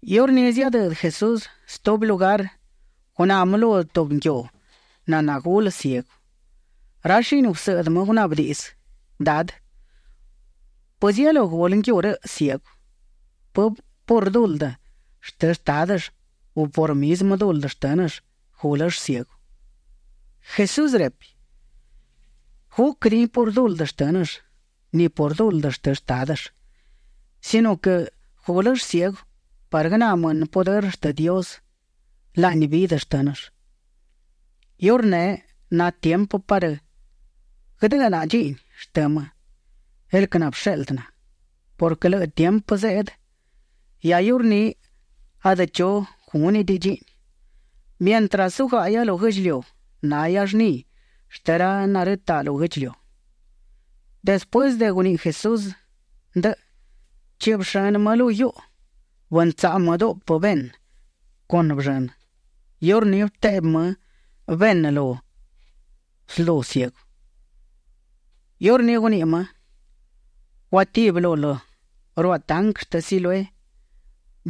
Iurní ziadëdë Jesús stubi lugar; guná më lu tubi nguiu naná gulë ciegu. Ra shini gusëꞌdë më gunaꞌbë diꞌdzë: ―Dadë, ¿pëzielú gulë nguiu rëꞌ ciegu; pë por duldë shtë shtádëll u por mizmë duldë shtë́nëll gúlëll ciegu? Jesús repi: ―Gúquëdiꞌin por duldë shtë́nëll ni por duldë shtë shtádëll, sino quë gúlëll ciegu parë guëná mënë pudërë shtë Dios laꞌni vidë shtë́nëll. Iurneꞌ na tiempë parë guëdë́ꞌnaꞌa dchiꞌni shtë më, el quë nabësheꞌldë na, purquë lëꞌë tiempë zeꞌdë, hia iurní adë chu gúnëdiꞌi dchiꞌni. Mientras zugáꞌahia lu guë́ꞌdchiliu, nahia llni shtë ra narëtaꞌ lu guë́ꞌdchiliu. Despuësë de guniꞌi Jesús ndëꞌë, bëchiꞌbë shënë më lu guiuꞌu. Bëntsaꞌu më duꞌpë benë con bëllënë. Iurní bëteꞌbi më benë lu slu ciegu. Iurní guniꞌi më: ―Guatibi lul ruaꞌ tanquë shtë Siloé.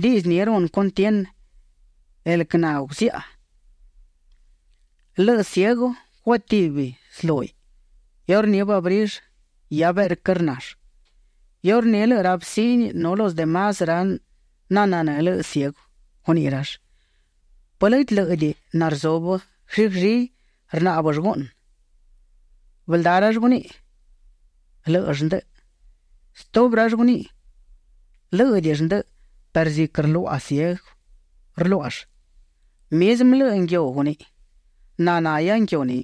(Diꞌdzë ni runë cuntienë, el quë naguziaꞌa.) Lëꞌë ciegu guatibi slúhiꞌ. Iurní bëabrill; hia beꞌrquë rnall. Iurní lëꞌë ra vëcini nu los de más ra nananë́ lëꞌë ciegu, guniꞌi rall: ―¿Pë lëdë lë́ꞌëdiꞌi narzubë glli glli; rnáꞌbëll guꞌnë? Bëldá rall guniꞌi: ―Lë́ꞌëll ndëꞌë. Stubi rall guniꞌi: ―Lë́ꞌëdiꞌill ndëꞌë perë ziquë rluaꞌa ciegu rluáꞌall. Mizmë lëꞌë nguiu guniꞌi: ―Na nahia nguiu ni.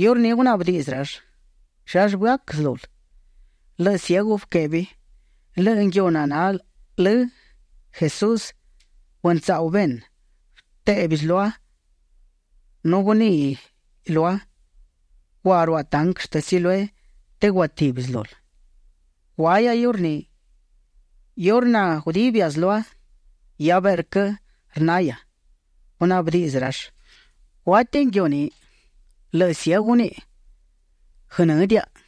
Iurní gunaꞌbë diꞌdzë rall: ―¿Llallë bëac slul? Lëꞌë ciegu bëquebi: ―Lëꞌë nguiu naná lë Jesús bëntsaꞌu benë. Bëtéꞌbiꞌ slua nu guníꞌiꞌ lua: “Gua ruaꞌ tanquë shtë Siloé të guatibi slul”. Guahia iurní. Iurë na gudibia slua, hia beꞌrquë rnahia. Gunaꞌbë diꞌdzë rall: ―¿Guátiꞌi nguiu ni? Lëꞌë ciegu guniꞌi: ―Guënë́diaꞌa.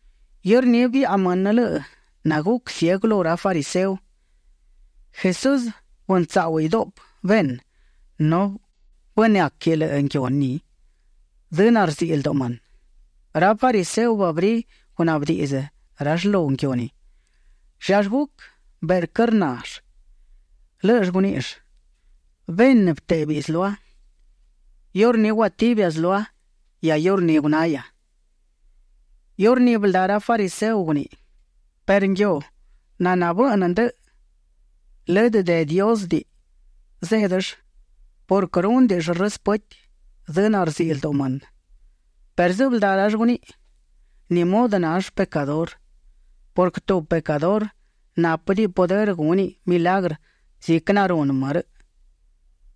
Iurní biaꞌa mënë lëꞌë naguc ciegu lu ra fariseo. Jesús bëntsáꞌuhiꞌ duꞌpë benë nu bënëáquiꞌ lëꞌë nguiu ni dzë narziꞌi lduꞌu mënë. Ra fariseo bëabrí gunaꞌbë diꞌdzë rall lu nguiu ni, llallë guc beꞌrquë rnall. Lë́ꞌëll guníꞌill: ―Benë bëtéꞌbiꞌ slua. Iurní guatibia slua; hia iurní gunahia. Iurní bëldá ra fariseo guniꞌi: ―Perë nguiu naná bëꞌnë ndëꞌë, lëdë de Diósëdiꞌi zéꞌdëll purquë rúnëdiꞌill rëspëti dzë narziꞌi lduꞌu mënë. Perë sëbëldá rall guniꞌi: ―¿Ni mudë nall pecadurë? purquë tubi pecadurë nápëdiꞌi pudërë gúniꞌ milagrë ziquë narunë më rëꞌ.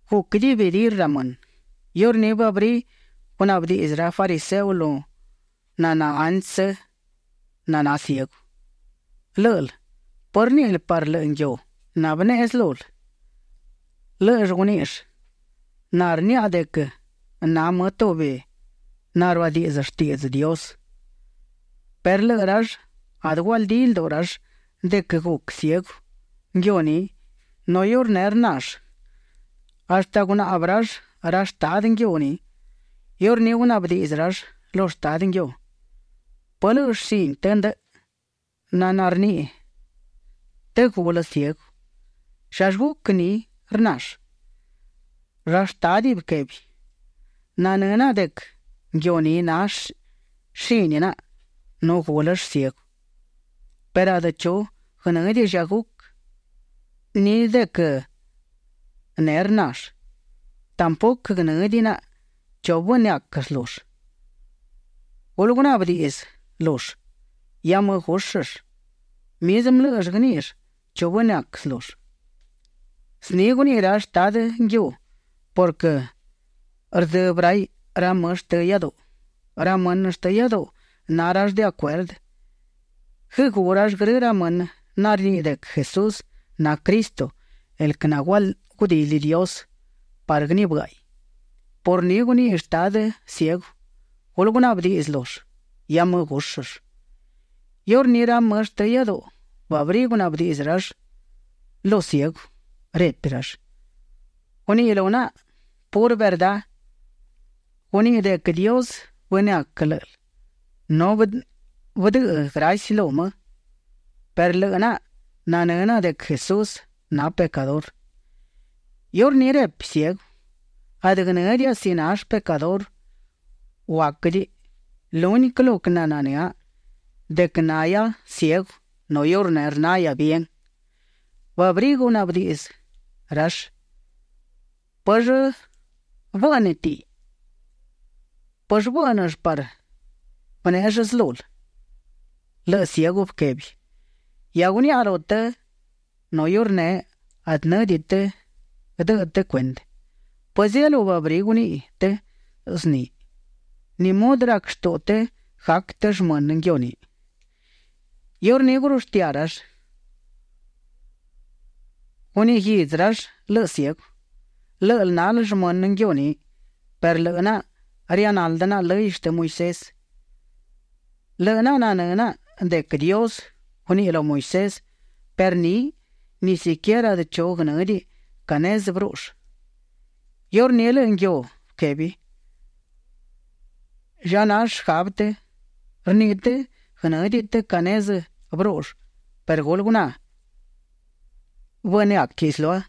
Guc dividir ra mënë. Iurní bëabrí gunaꞌbë diꞌdzë ra fariseo lu naná antsë na ciegu: ―Lë́ꞌël, ¿pë rníꞌil parë lëꞌë nguiu nabëneꞌe slul? Lë́ꞌëll guníꞌill: ―Na rniaꞌa de quë na më tubi naruadiꞌdzë shtiꞌdzë Dios. Perë lëꞌë rall adë gualdídiꞌi lduꞌu rall de quë guc ciegu nguiu ni nu iurneꞌ rnall, hashtë gunaꞌbë rall ra shtadë nguiu ni. Iurní gunaꞌbë diꞌdzë rall lu shtadë nguiu: ―¿Pë lëꞌë shini të ndëꞌë? naná rniꞌi të gulë ciegu. ¿Llallë guc ni rnall? Ra shtádiꞌ bëquebi: ―Nanë́ naꞌa de quë nguiu ni na shini naꞌa nu gúlëll ciegu perë adë chu guënë́diꞌi lla guc ni de quë neꞌ rnall. Tampuquë guënë́diꞌi naꞌa chu bënëac slull. Gulë gunaꞌbë diꞌdzë lull. Hia më gúshëll; mizmë lë́ꞌëll guëníꞌill chu bënëac slull. Zni guniꞌi ra shtadë nguiu purquë rdzëbë raiꞌ ra më shtë iáduꞌu. Ra mënë shtë iáduꞌu na rall de acuerdë guëgú rall grë ra mënë narniꞌi de quë Jesús na Cristo, el quë nagudili Dios parë guënibë́ꞌaiꞌ. Por ni guniꞌi shtadë ciegu: “Gulë gunaꞌbë diꞌdzë lull; hia më gúshëll”. Iurní ra mënë shtë iáduꞌu, bëabrí gunaꞌbë rall lu ciegu; repi rall: ―Guniꞌi lu naꞌa purë verdá. Guniꞌi de quë Dios bënëac lë́ꞌël nu bëdëꞌë graci lu më, perë lëꞌë naꞌa nanë́ naꞌa de quë Jesús na pecadurë. Iurní repi ciegu: ―Adë guënë́diaꞌa si nall pecadurë u aquëdiꞌi; lúniquë lo quë nananë́a de quë na nahia ciegu nu iurneꞌ rnahia bien. Bëabrí gunaꞌbë diꞌdzë rall: ―¿Pëllë bë́ꞌnëtiꞌi? ¿Pëllë bë́ꞌnëll parë bënéꞌell slul? Lëꞌë ciegu bëquebi: ―Hia guniaꞌa lu të nu iurneꞌ adë në́diꞌi të guëdëꞌë të cuendë. ¿Pëzielú bëabrí guniꞌi të zniꞌi? ¿Ni mudë rac shtuꞌu të gac të shmënë nguiu ni? Iurní gurushtiá rall. Guniꞌi guidzë rall lëꞌë ciegu: ―Lë́ꞌël nal shmënë nguiu ni, perë lëꞌë naꞌa rianaldë naꞌa lëy shtë Moisés. Lëꞌë naꞌa nanë́ naꞌa de quë Dios guniꞌi lu Moisés perë níꞌiꞌ, ni siquierë adë chu guënë́diꞌi ca nezë bërúꞌull. Iurní lëꞌë nguiu bëquebi: ―¿Lla na shgabë të? Rniꞌi të guënë́diꞌi të ca nezë bërúꞌull perë gulë guná, bënëáquiꞌ slua.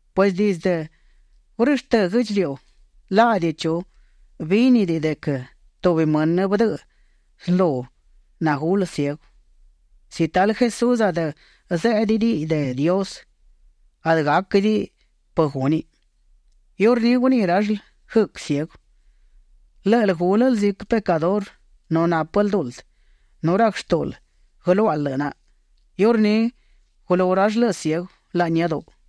Pues dizdë gurështë́ guë́ꞌdchiliu, laꞌdi chu bínidiꞌi de quë tubi mënë bëdëꞌë slu nagulë ciegu. Si talë Jesús adë zéꞌdëdiꞌiꞌ de Dios, adë gáquëdiꞌi pë gúniꞌ. Iurní guniꞌi rall guëc ciegu: ―Lë́ꞌël gúlël ziquë pecadurë nu nápël duldë, nu rac shtúꞌul guëluáꞌal lëꞌë naꞌa. Iurní gulú rall lëꞌë ciegu laꞌni iáduꞌu.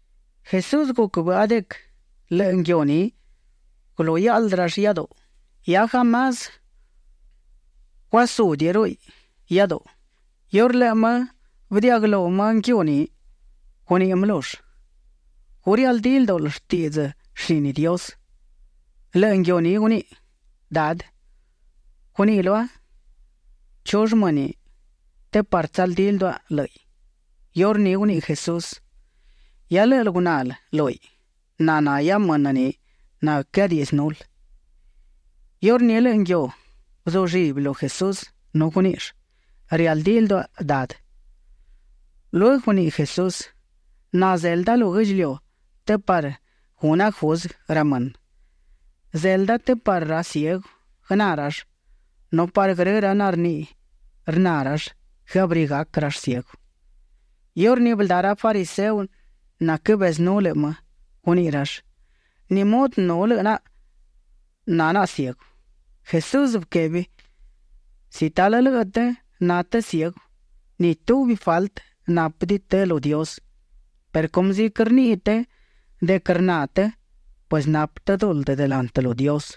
Jesús guc bëꞌa de quë lëꞌë nguiu ni gulú hiaꞌldë rall iáduꞌu, hia jamás guasúdiꞌiruꞌuiꞌ iáduꞌu. Iurë lëꞌë më bëdiaꞌguëlú lëꞌë nguiu ni, guniꞌi më lull: ―¿Gu rialdí ldúꞌul shtiꞌdzë shini Dios? Lëꞌë nguiu ni guniꞌi: ―Dadë, guniꞌi lua ¿chull më ni? të parë tsaldí lduaꞌa lë́ꞌiꞌ. Iurní guniꞌi Jesús: ―Hia lë́ꞌël gunal lúhiꞌ. Na nahia mënë ni naquëadiꞌdzënul. Iurní lëꞌë nguiu bëzullibi lu Jesús nu guníꞌill: ―Rialdí lduaꞌa, Dadë. Lueguë guniꞌi Jesús: ―Na zelda lu guë́ꞌdchiliu të parë guna juzguë ra mënë. Zelda të parë ra ciegu guëná rall, nu parë grë ra narniꞌi rna rall, guëabrí gac rall ciegu. Iurní bëldá ra fariseo naquëbezënú lëꞌë më, guniꞌi rall: ―¿Ni mudë nu lëꞌë naꞌa na naꞌa ciegu? Jesús bëquebi: ―Si talë lëꞌë të na të ciegu, ni tubi faltë nápëdiꞌi të lu Dios, perë cumë ziquë rniꞌi të de quë rna të, pues napë të duldë delantë lu Dios.